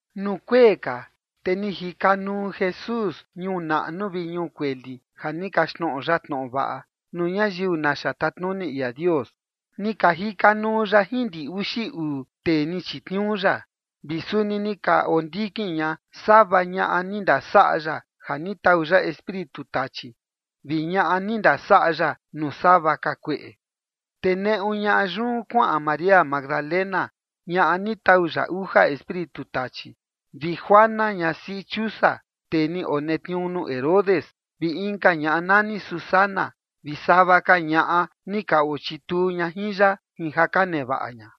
Nuu kuee ka te ni jika nuu Jesús ñuu naꞌnu vi ñuu kueli ja ni kaxtnoꞌo ya tnoꞌo vaꞌa nuu ñayiu naxa tatnuni ia Dios. Ni ka jika nuu ya jin ndi uxi uu tee ni chitniuu ya, vi suni ni ka ondikin ña sava ñaꞌa ni ndasaꞌa ya ja ni tau ya espíritu tachi vi ñaꞌa ni ndasaꞌa ya nuu sava ka kueꞌe. Te neꞌu ñaꞌa yun kuaꞌan María Magdalena, ñaꞌa ni tau ya uja espíritu tachi, vi Juana, ñasiꞌi Chusa, tee ni onetniuu nuu Herodes, vi inka ñaꞌa nani Susana vi sava ka ñaꞌa ni ka ochituu ña jin ya jin ja ka nevaꞌa ña.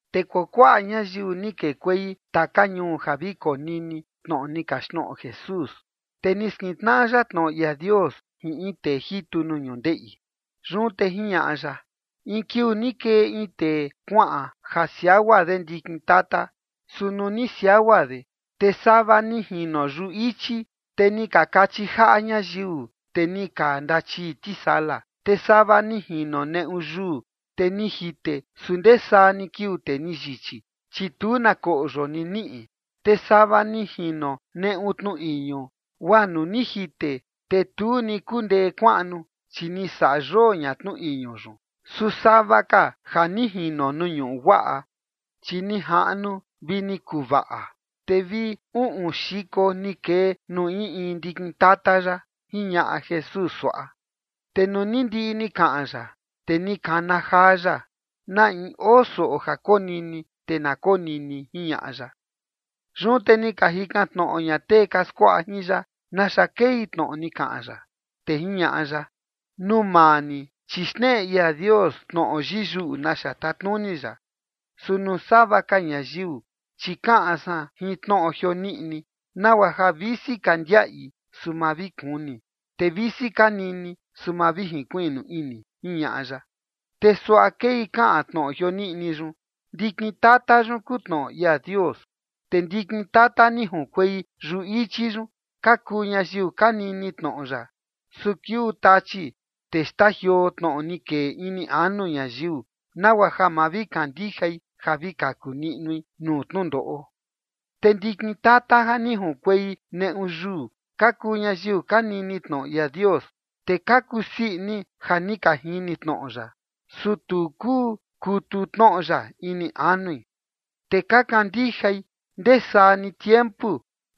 Te kuakuaꞌa ñayiu ni kekuei taka ñuu ja vi konini tnoꞌo ni kaxtnoꞌo Jesús, te ni skintnaꞌa ya tnoꞌo ia Dios jin in tee jitu nuu ñundeꞌi. Yun te jiñaꞌa ya: ―In kiuu ni kee in tee kuaꞌan ja siagua de ndikin tata. Su nuu ni siagua de, te sava ni jino yuꞌu ichi, te ni ka kachi jaꞌa ñayiu, te ni ka ndachii tisala. Te sava ni jino neꞌu yuu, te ni jite. Su ndee saa ni kiuu, te ni yichi, chi tu na koꞌyo ni niꞌi. Te sava ni jino neꞌu tnu iñu, guaa nuu ni jite, te tu ni kundee kuaꞌnu, chi ni saꞌa yoo ña tnu iñu yun. Su sava ka ja ni jino nuu ñuꞌu guaꞌa, chi ni jaꞌnu vi ni kuvaꞌa, te vi uꞌun xiko ni kee nuu in in ndikin tata yaꞌa ―jiñaꞌa Jesús suaꞌa. Te nuu ni ndiꞌi ni kaꞌan ya, te ni kana jaa ya: ―Na in oo soꞌo ja konini, te na konini ―jiñaꞌa ya. Yun te ni ka jikan tnoꞌo ña tee ka skuaꞌa jin ya naxa kei tnoꞌo ni kaꞌan ya. Te jiñaꞌa ya: ―Nuu maa ni, chi xneꞌe ia Dios tnoꞌo yiyuꞌu naxa tatnuni ya. Su nuu sava ka ñayiu, chi kaꞌan san jin tnoꞌo jioniꞌni, nagua ja visi ka ndiaꞌi, su ma vi kuni; te visi ka nini, su ma vi jinkuiꞌnu ini ―jiñaꞌa ya. ’Te suaꞌa kei kaꞌan tnoꞌo jioniꞌni yun: Ndikin tata yun kuu tnoꞌo ia Dios. Te ndikin tata ni junkuei yuꞌu ichi yun ka kuu ñayiu ka nini tnoꞌo ya. Su kiuu tachi, te xtajioo tnoꞌo ni kee ini anu ñayiu, nagua ja ma vi kandijai ja vi kaku niꞌnui nuu tnundoꞌo. Te ndikin tata ja ni junkuei neꞌu yuu ka kuu ñayiu ka nini tnoꞌo ia Dios, te ka kusii ini ja ni ka jini tnoꞌo ya, su tu kuu kutu tnoꞌo ya ini anui. Te ka kandijai ndee saa ni tiempu,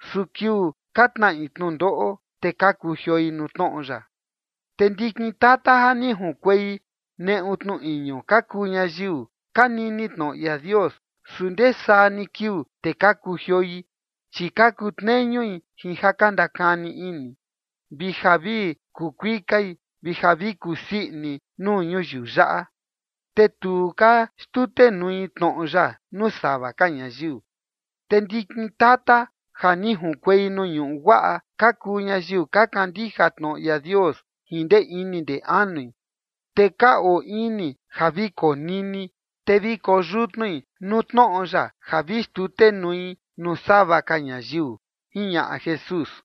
su kiuu ka tnaꞌi tnundoꞌo, te ka kujioi nuu tnoꞌo ya. Te ndikin tata ja ni junkuei neꞌu tnu iñu ka kuu ñayiu ka nini tnoꞌo ia Dios, su ndee saa ni kiuu, te ka kujioi, chi ka kutneñui jin ja ka ndakani ini, vi ja vi kuu kuikai, vi ja vi kusii ini nuu ñuyiu yaꞌa, te tu ka xtutenui tnoꞌo ya nuu sava ka ñayiu. Te ndikin tata ja ni junkuei nuu ñuꞌu guaꞌa ka kuu ñayiu ka kandija tnoꞌo ia Dios jin ndee ini ndee anui, te ka oo ini ja vi konini, te vi koyutnui nuu tnoꞌo ya ja vi xtutenui nuu sava ka ñayiu ―jiñaꞌa Jesús.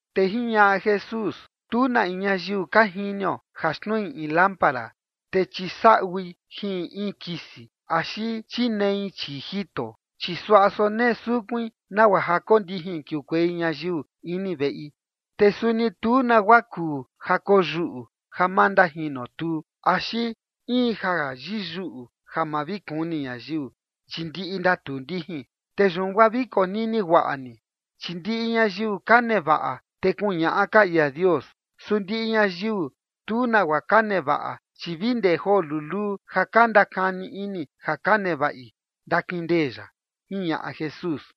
Te jiñaꞌa Jesús: ―Tu na in ñayiu ka jinio ja xtnui in lámpara, te chisaꞌui jin in kisi, axi chinee chii jito, chi suaꞌa sonee sukuin nagua ja kondijin kiukuei ñayiu ini veꞌi. Te suni tu nagua kuu ja koyuꞌu ja ma ndajinotuu, axi in ja yiyuꞌu ja ma vi kuni ñayiu, chi ndiꞌi ndatuu ndijin. Te yun guaa vi konini guaꞌa ni, chi ndiꞌi ñayiu ka nevaꞌa, te kuñaꞌa ka ia Dios. Su ndiꞌi ñayiu tu nagua ka nevaꞌa, chi vi ndee joo luluu ja ka ndakani ini ja ka nevaꞌi, ndakindee ya ―jiñaꞌa Jesús.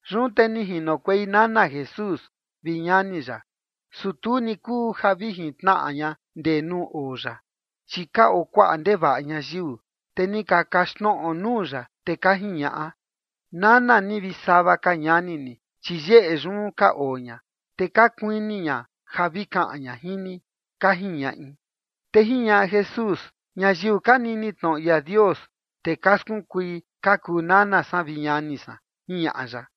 Yun te ni jinokuei nana Jesús vi ñani ya, su tu ni kuu ja vi jintnaꞌa ña ndee nuu oo ya, chi ka oo kuaꞌa ndevaꞌa ñayiu. Te ni ka kaxtnoꞌo nuu ya, te ka jiñaꞌa: ―Nana ni vi sava ka ñani ni, chi yeꞌe yun ka oo ña, te ka kuini ña ja vi kaꞌan ña jin ni ―ka jiñaꞌi. Te jiñaꞌa Jesús: ―Ñayiu ka nini tnoꞌo ia Dios, te ka skunkui, ka kuu nana san vi ñani san ―jiñaꞌa ya.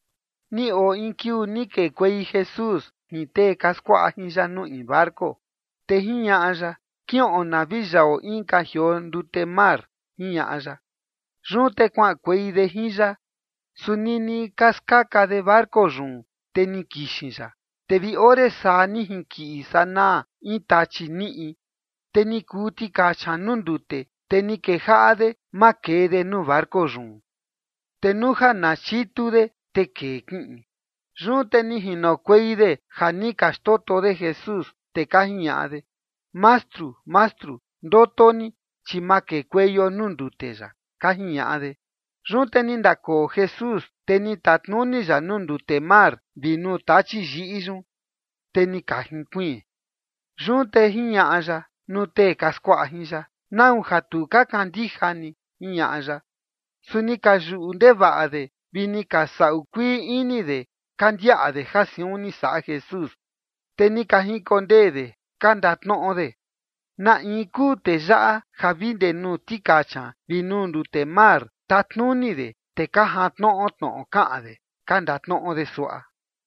Ni oo in kiuu ni kekuei Jesús jin tee ka skuaꞌa jin ya nuu in barco, te jiñaꞌa ya: ―Kiꞌon na vi yaꞌo inka jioo ndute mar ―jiñaꞌa ya. Yun te kuaꞌankuei de jin ya. Su nini ka skaka de barco yun, te ni kixin ya. Te vi ore saa ni jinkiꞌin sanaa in tachi niꞌi, te ni kuu tikacha nuu ndute, te ni kejaꞌa de makee de nuu barco yun, te nuu ja na chitu de, te kee kiꞌin. Yun te ni jinokuei de ja ni ka xndoto de Jesús, te ka jiñaꞌa de: ―Mastru, Mastru, ndoto ni, chi makekueio nuu ndute yaꞌa ―ka jiñaꞌa de. Yun te ni ndakoo Jesús, te ni tatnuni ya nuu ndute mar vi nuu tachi yiꞌi yun, te ni ka jinkuiin. Yun te jiñaꞌa ya nuu tee ka skuaꞌa jin ya: ―¿Nau ja tu ka kandija ni? ―jiñaꞌa ya. Su ni ka yuꞌu ndevaꞌa de vi ni ka saꞌu kuii ini de ka ndiaꞌa de ja siun ni saꞌa Jesús, te ni ka jinkondee de ka ndatnoꞌo de: ―¿Na in kuu tee yaꞌa ja vi ndee nuu tikacha vi nuu ndute mar tatnuni de, te ka jantnoꞌo tnoꞌo kaꞌan de? ―ka ndatnoꞌo de suaꞌa.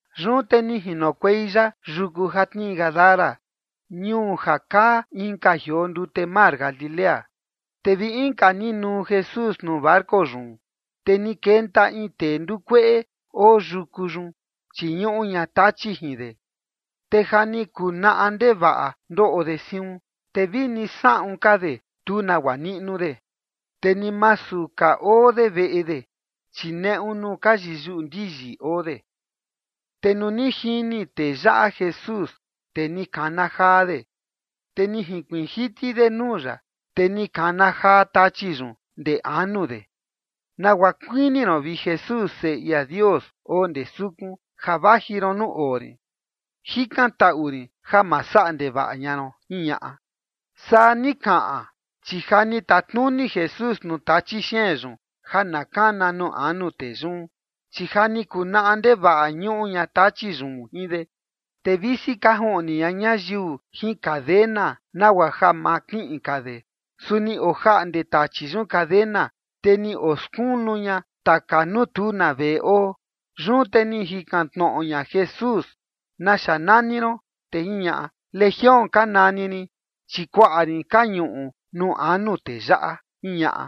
Yun te ni jinokuei ya yuku ja tnii Gadara, ñuu ja kaa inka jioo ndute mar Galilea. Te vi inka ni nuu Jesús nuu barco yun, te ni kenta in tee ndukueꞌe oo yuku yun, chi ñuꞌu ña tachi jin de. Te ja ni kuu naꞌa ndevaꞌa ndoꞌo de siun, te vini saꞌun ka de tu nagua niꞌnu de. Te ni masu ka oo de veꞌe de, chi neꞌu nuu ka yiyuꞌu ndiyi oo de. Te nuu ni jini tee yaꞌa Jesús, te ni kana jaa de, te ni jinkuiin jiti de nuu ya, te ni kana jaa tachi yun ndee anu de: ―¿Nagua kuini ron, vi Jesús, Seꞌe ia Dios oo ndee sukun, ja vaji ron nuu oo rin? Jikantaꞌu rin ja ma saꞌa ndevaꞌa ña ron ―jiñaꞌa. Saa ni kaꞌan, chi ja ni tatnuni Jesús nuu tachi xeen yun ja na kana nuu anu tee yun. Chi ja ni kuu naꞌa ndevaꞌa ñuꞌu ña tachi yun jin de. Te visi ka juꞌni ña ñayiu jin cadena, nagua ja ma kiꞌin ka de, su ni ojaꞌnde tachi yun cadena, te ni oskunu ña taka nuu tu na veꞌe oo. Yun te ni jikan tnoꞌo ña Jesús: ―¿Naxa nani ron? Te jiñaꞌa: ―Legión ka nani rin, chi kuaꞌa rin ka ñuꞌu nuu anu tee yaꞌa ―jiñaꞌa.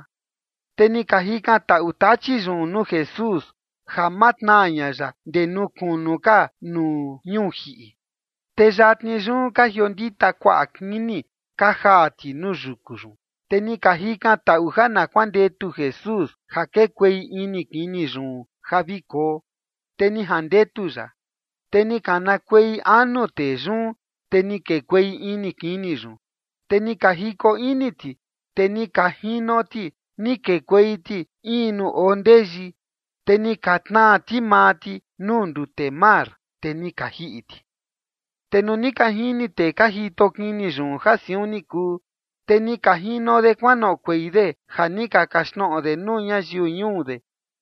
Te ni ka jikantaꞌu tachi yun nuu Jesús ja ma tnaa ña ya ndee kunu ka nuu ñuu jiꞌi. Te yatni yun ka jiondita kuaꞌa kini ka jaa ti nuu yuku yun. Te ni ka jikantaꞌu ja na kuandetu Jesús ja kekuei ini kini yun ja vi koo, te ni jandetu ya. Te ni kanakuei anu tee yun, te ni kekuei ini kini yun. Te ni ka jiko ini ti, te ni ka jino ti, ni kekuei ti in nuu oo ndeyi, te ni ka tnaa ti maa ti nuu ndute mar, te ni ka jiꞌi ti. Te nuu ni ka jini tee ka jito kini yun ja siun ni kuu, te ni ka jino de kuanoꞌokuei de ja ni ka kaxtnoꞌo de nuu ñayiu ñuu de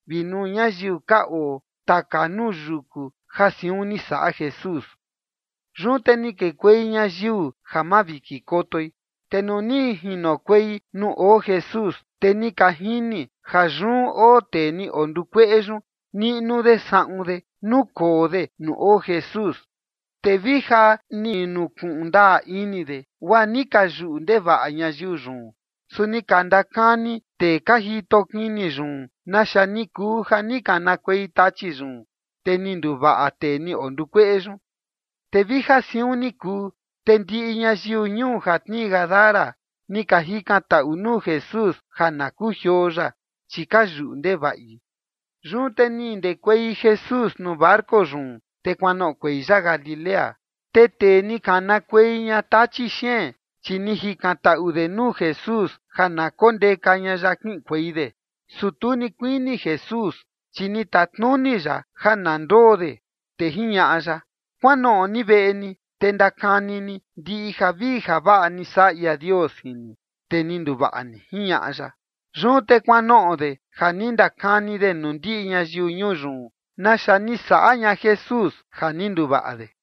vi nuu ñayiu ka oo taka nuu yuku ja siun ni saꞌa Jesús. Yun te ni kekuei ñayiu ja mavijinkotoi. Te nuu ni jinokuei nuu oo Jesús, te ni ka jini ja yun oo tee ni ondukueꞌe yun, niꞌnu de saꞌun de, nukoo de nuu oo Jesús, te vija ni nukuꞌun ndaa ini de, guaa ni ka yuꞌu ndevaꞌa ñayiu yun. Su ni ka ndakani tee ka jito kini yun naxa ni kuu ja ni kanakuei tachi yun, te ni nduvaꞌa tee ni ondukueꞌe yun. Te vija siun ni kuu, te ndiꞌi ñayiu ñuu ja tnii Gadara ni ka jikantaꞌui nuu Jesús ja na kujioo ya, chi ka yuꞌu ndevaꞌi. Yun te ni ndekuei Jesús nuu barco yun, te kuanoꞌokuei ya Galilea. Te tee ni kanakuei ña tachi xeen, chi ni jikantaꞌu de nuu Jesús ja na kondeka ña ya kiꞌinkuei de. Su tu ni kuini Jesús, chi ni tatnuni ya ja na ndoo de, te jiñaꞌa ya: ―Kuanoꞌo ni veꞌe ni, te ndakani ni ndiꞌi javii javaꞌa ni saꞌa ia Dios jin ni, te ni nduvaꞌa ni ―jiñaꞌa ya. Yun te kuanoꞌo de ja ni ndakani de nuu ndiꞌi ñayiu ñuu yun naxa ni saꞌa ña Jesús ja ni nduvaꞌa de.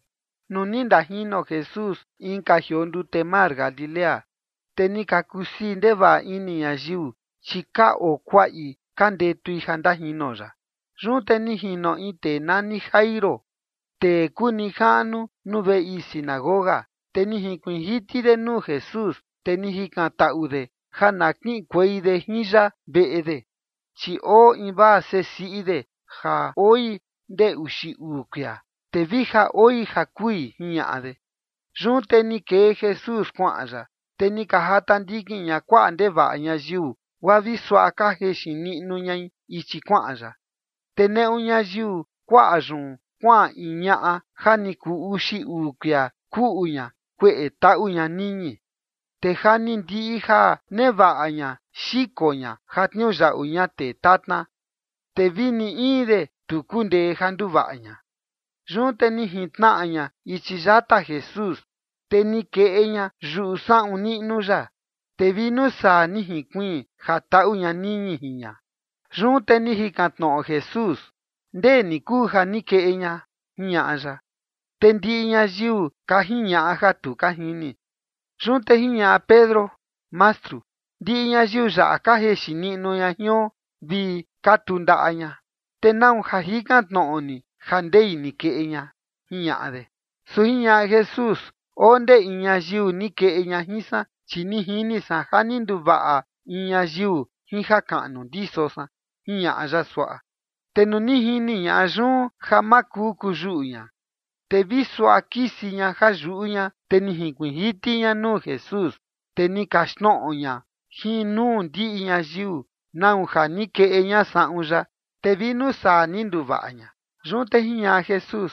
Nuu ni ndajino Jesús inka jioo ndute mar Galilea, te ni ka kusii ndevaꞌa ini ñayiu, chi ka oo kuaꞌi ka ndetui ja ndajino ya. Yun te ni jino in tee nani Jairo, tee kuu nijaꞌnu nuu veꞌe ii sinagoga. Te ni jinkuiin jiti de nuu Jesús, te ni jikantaꞌu de ja na kiꞌinkuei de jin ya veꞌe de. Chi oo invaa seꞌe siꞌi de ja oi ndee uxi uu kuia, te vija oi ja kui, jiñaꞌa de. Yun te ni kee Jesús kuaꞌan ya, te ni ka jata ndikin ña kuaꞌa ndevaꞌa ñayiu, guaa vi suaꞌa ka jexin niꞌnu ñai ichi kuaꞌan ya. Te neꞌu ñayiu kuaꞌa yun kuaꞌan in ñaꞌa ja ni kuu uxi uu kuia kuꞌu ña kueꞌe taꞌu ña niñi. Te ja ni ndiꞌi ja nevaꞌa ña xiko ña ja tniuyaꞌu ña tee tatna, te vi ni in de tu kundee ja nduvaꞌa ña. Yun te ni jintnaꞌa ña ichi yata Jesús, te ni keꞌe ña yuꞌu saꞌun niꞌnu ya, te vi nuu saa ni jinkuiin ja taꞌu ña niñi jin ña. Yun te ni jikan tnoꞌo Jesús: ―¿Ndee ni kuu ja ni keꞌe ña? ―jiñaꞌa ya. Te ndiꞌi ñayiu ka jiñaꞌa ja tu ka jini. Yun te jiñaꞌa Pedro: ―Mastru, ndiꞌi ñayiu yaꞌa ka jexin niꞌnu ña jion vi katu ndaꞌa ña, te ¿nau ja jikan tnoꞌo ni ja ndei ni keꞌe ña? ―jiñaꞌa de. Su jiñaꞌa Jesús: ―Oo ndee in ñayiu ni keꞌe ña jin san, chi ni jini san ja ni nduvaꞌa in ñayiu jin jakaꞌnu ndiso san ―jiñaꞌa ya suaꞌa. Te nuu ni jini ñaꞌa yun ja ma kuu kuyuꞌu ña, te vi suaꞌa kisi ña ja yuꞌu ña, te ni jinkuiin jiti ña nuu Jesús, te ni kaxtnoꞌo ña jin nuu ndiꞌi ñayiu nau ja ni keꞌe ña saꞌun ya, te vi nuu saa ni nduvaꞌa ña. Yun te jiñaꞌa Jesús: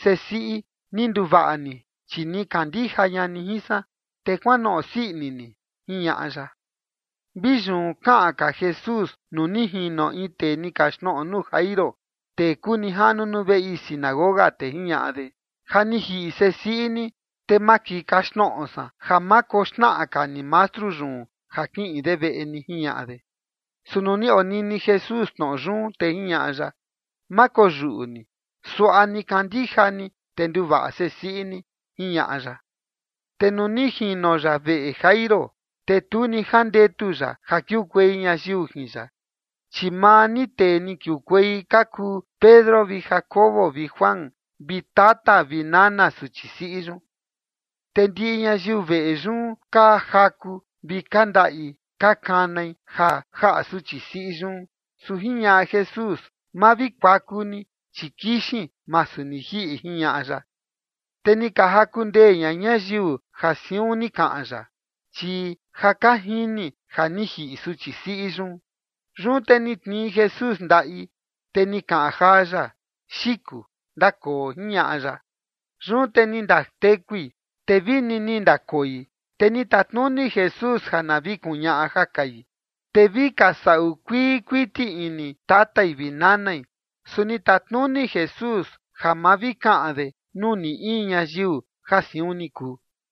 ―Sesiꞌi, ni nduvaꞌa ni, chi ni kandija ña ni jin san. Te kuanoꞌo sii ini ni ―jiñaꞌa ya. Vi yun kaꞌan ka Jesús nuu ni jino in tee ni kaxtnoꞌo nuu Jairo, tee kuu nijaꞌnu nuu veꞌe ii sinagoga, te jiñaꞌa de: ―Ja ni jiꞌi sesiꞌi ni, te makii kaxtnoꞌo san ja ma koxnaꞌa ka ni mastru yun ja kiꞌin de veꞌe ni ―jiñaꞌa de. Su nuu ni onini Jesús tnoꞌo yun, te jiñaꞌa ya: ―Ma koyuꞌu ni. Suaꞌa ni kandija ni, te nduvaꞌa sesiꞌi ni ―jiñaꞌa ya. Te nuu ni jino ya veꞌe Jairo, te tu ni jandetu ya ja kiukuei ñayiu jin ya, chi maa ni tee ni kiukuei ka kuu Pedro vi Jacobo vi Juan vi tata vi nana suchi siꞌi yun. Te ndiꞌi ñayiu veꞌe yun ka jaku vi ka ndaꞌi ka kanai ja jaꞌa suchi siꞌi yun, su jiñaꞌa Jesús: ―Ma vi kuaku ni, chi kixin, masu ni jiꞌi ―jiñaꞌa ya. Te ni ka jaku ndee ña ñayiu ja siun ni kaꞌan ya, chi ja ka jini ja ni jiꞌi suchi siꞌi yun. Yun te ni tnii Jesús ndaꞌi, te ni kaꞌan jaa ya: ―Xiku, ndakoo ―jiñaꞌa ya. Yun te ni ndatekui, te vini ni ndakoi. Te ni tatnuni Jesús ja na vi kuñaꞌa ja kai. Te vi ka saꞌu kuii kuiti ini tatai vi nanai, su ni tatnuni Jesús ja ma vi kaꞌan de nuu ni in ñayiu ja siun ni kuu.